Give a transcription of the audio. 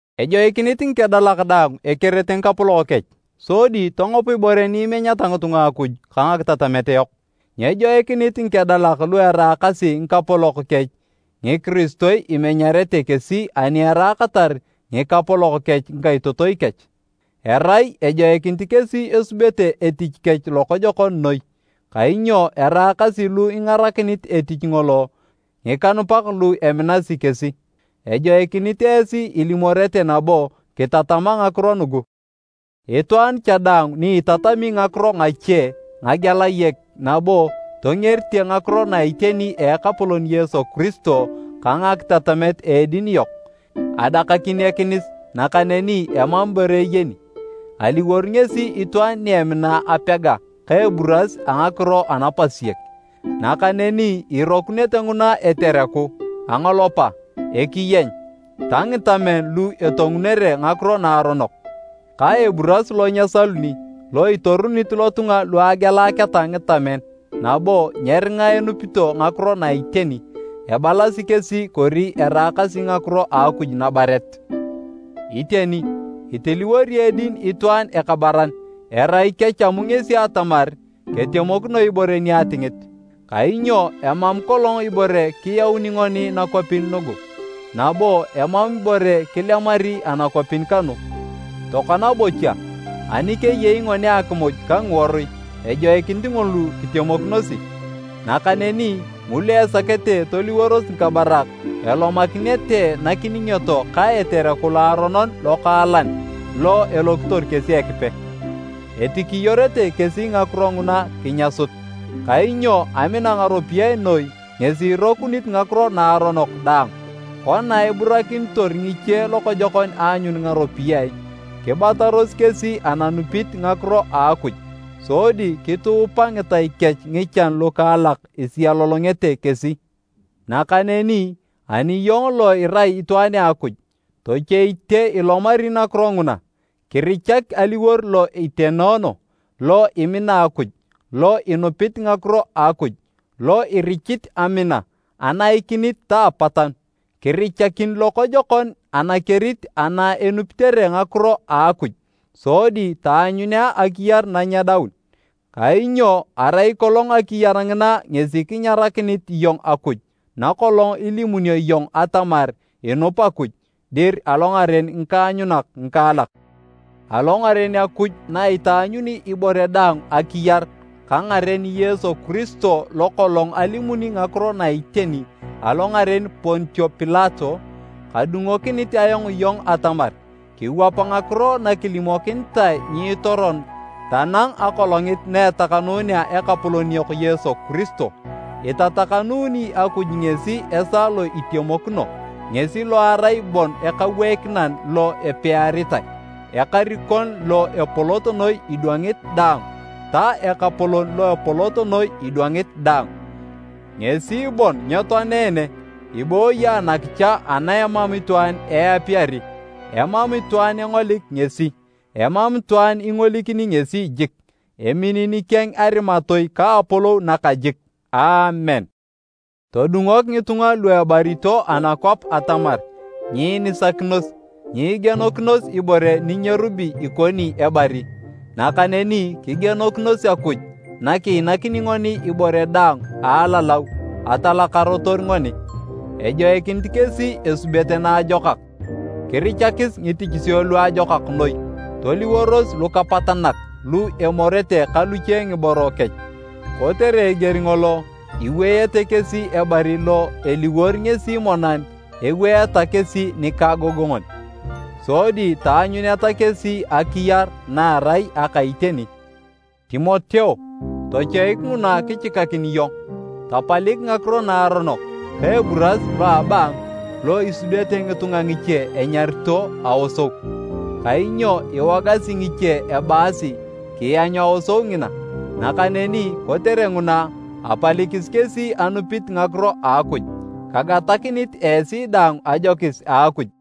Ejoikinit ngikedalak daang ekerete ngikapolok kech sodi tongop ibore ni imenyeta ngitunga Akuj ka ngakitatamet yok. Nyejoikinit ngikedalak lu eraakasi ngikapolok kech ngikiristoi imenyarete kesi ani eraakatar ngikapolok kech ngikaitotoi kech. Erai ejoikinit kesi esubete etich kech lokojokon noi kainyo eraakasi lu ingarakinit etich ngolo ngikanupak lu eminasi kesi. Ejoikinit esi ilimorete nabo kitatama ngakiro nugu. Itwaan cha daang ni itatami ngakiro ngache ngagelayek nabo tongerite ngakiro na iteni a Ekapolon Yesu Kiristo ka ngakitatamet a edin yok, adakakin ekinis nakaneni emam ibore eyeni. Aliwor ngesi itwaan ni emina apega ka eburas a ngakiro anapasiek, nakaneni irokunete nguna etereku, angolopa, ekiyeny ta ngitamen lu etongunere ngakiro naaronok, ka eburas lo nyesaluni lo itorunit lotunga lu agealaketa ngitamen nabo nyeringa enupito ngakiro na iteni. Ebalasi kesi kori eraakasi ngakiro a Akuj nabaret. Iteni, itiliwori edin itwaan ekabaran erai kechamu ngesi atamar ketemokino ibore ni atingit. Kainyo emam kolong ibore kiyauni ngoni nakwapin nugu, nabo emam ibore kilemari anakwapin kanu. Tokona bocha, ani keyei ngoni akimuj ka ngiworui, ejoikinit ngulu kitemokinosi. Nakaneni ngulu esakete toliworos ngikabarak, elomakinete nakiningioto ka etereku loaronon lokaalan lo elokitor kesi Ekipe. Etikiyorete kesi ngakiro nguna kinyasut. Kainyo amina ngaropiyae noi ngesi irokunit ngakiro naaronok daang. Kona eburakinitor ngiche lokojokon aanyun ngaropiyae, kibataros kesi ananupit ngakiro a Akuj sodi kituupa ngitai kech ngichan lukaalak isialolongete kesi. Nakaneni ani iyong lo irai itwaan a Akuj, tochoite ilomari nakiro nguna. Kirichak aliwor lo itenoono, lo imina Akuj, lo inupit ngakiro a Akuj, lo irichit amina, anaikinit ta apatanu. Kirichakin lokojokon anakerit ana enupitere ngakiro a Akuj sodi taanyunea akiyar nanyedaun. Kainyo arai kolong akiyar ngina ngesi kinyarakinit iyong Akuj na kolong ilimunio iyong atamar inup Akuj dir alongaren ngikaanyunak ngikaalak. Alongaren Akuj na itaanyuni ibore daang akiyar ka ngaren Yesu Kiristo lo kolong alimuni ngakiro na iteni alongaren Pontio Pilato, kadungokinit ayong iyong atamar kiwap ngakiro nakilimokinitae nyiitoron tanang Akolongit na etakanunea Ekapolon yok Yesu Kiristo. Itatakanuuni Akuj ngesi esaa lo itemokino, ngesi lo erai bon Ekaweikinan lo epiaritae, Ekarikon lo epolot noi idwangit daang ta Ekapolon lo epolot noi idwangit daang. Ngesi bon nyetoanene, ibooyi anakicha ana emam itwaan eapiyari. Emam itwaan engolik ngesi, emam itwaan ingolikini ngesi jik. Emini nikeng arimatoi ka apolou nakajik! Aamen. Todungok ngitunga lu ebarito anakwap atamar nyiinisakinos, nyiigienokinos ibore ninyerubi ikoni ebari, nakaneni kigienokinos Akuj nakiinakini ngoni ibore daang a alalau atalakarotor ngoni. Ejoikinit kesi esubete naajokak, kirichakis ngitichisio luajokak noi, toliworos lukapatanak lu emorete ka luche ngiboro kech. Kotere eger ngolo iweyete kesi ebari lo eliworo ngesi monan eweeta kesi nikaagongon. Sodi taanyuneta kesi akiyar na erai aka iteni. Timoteo, tochoik nguna kichikakin iyong. Tapalik ngakiro naaronok ka eburas lo a abaangu lo isudete ngitunga ngiche enyarito “Aosou”. Kainyo iwogasi ngiche ebaasi kianyu aosou ngina, nakaneni kotere nguna, apalikis kesi anupit ngakiro a Akuj. Kagatakinit esi daang ajokis a Akuj!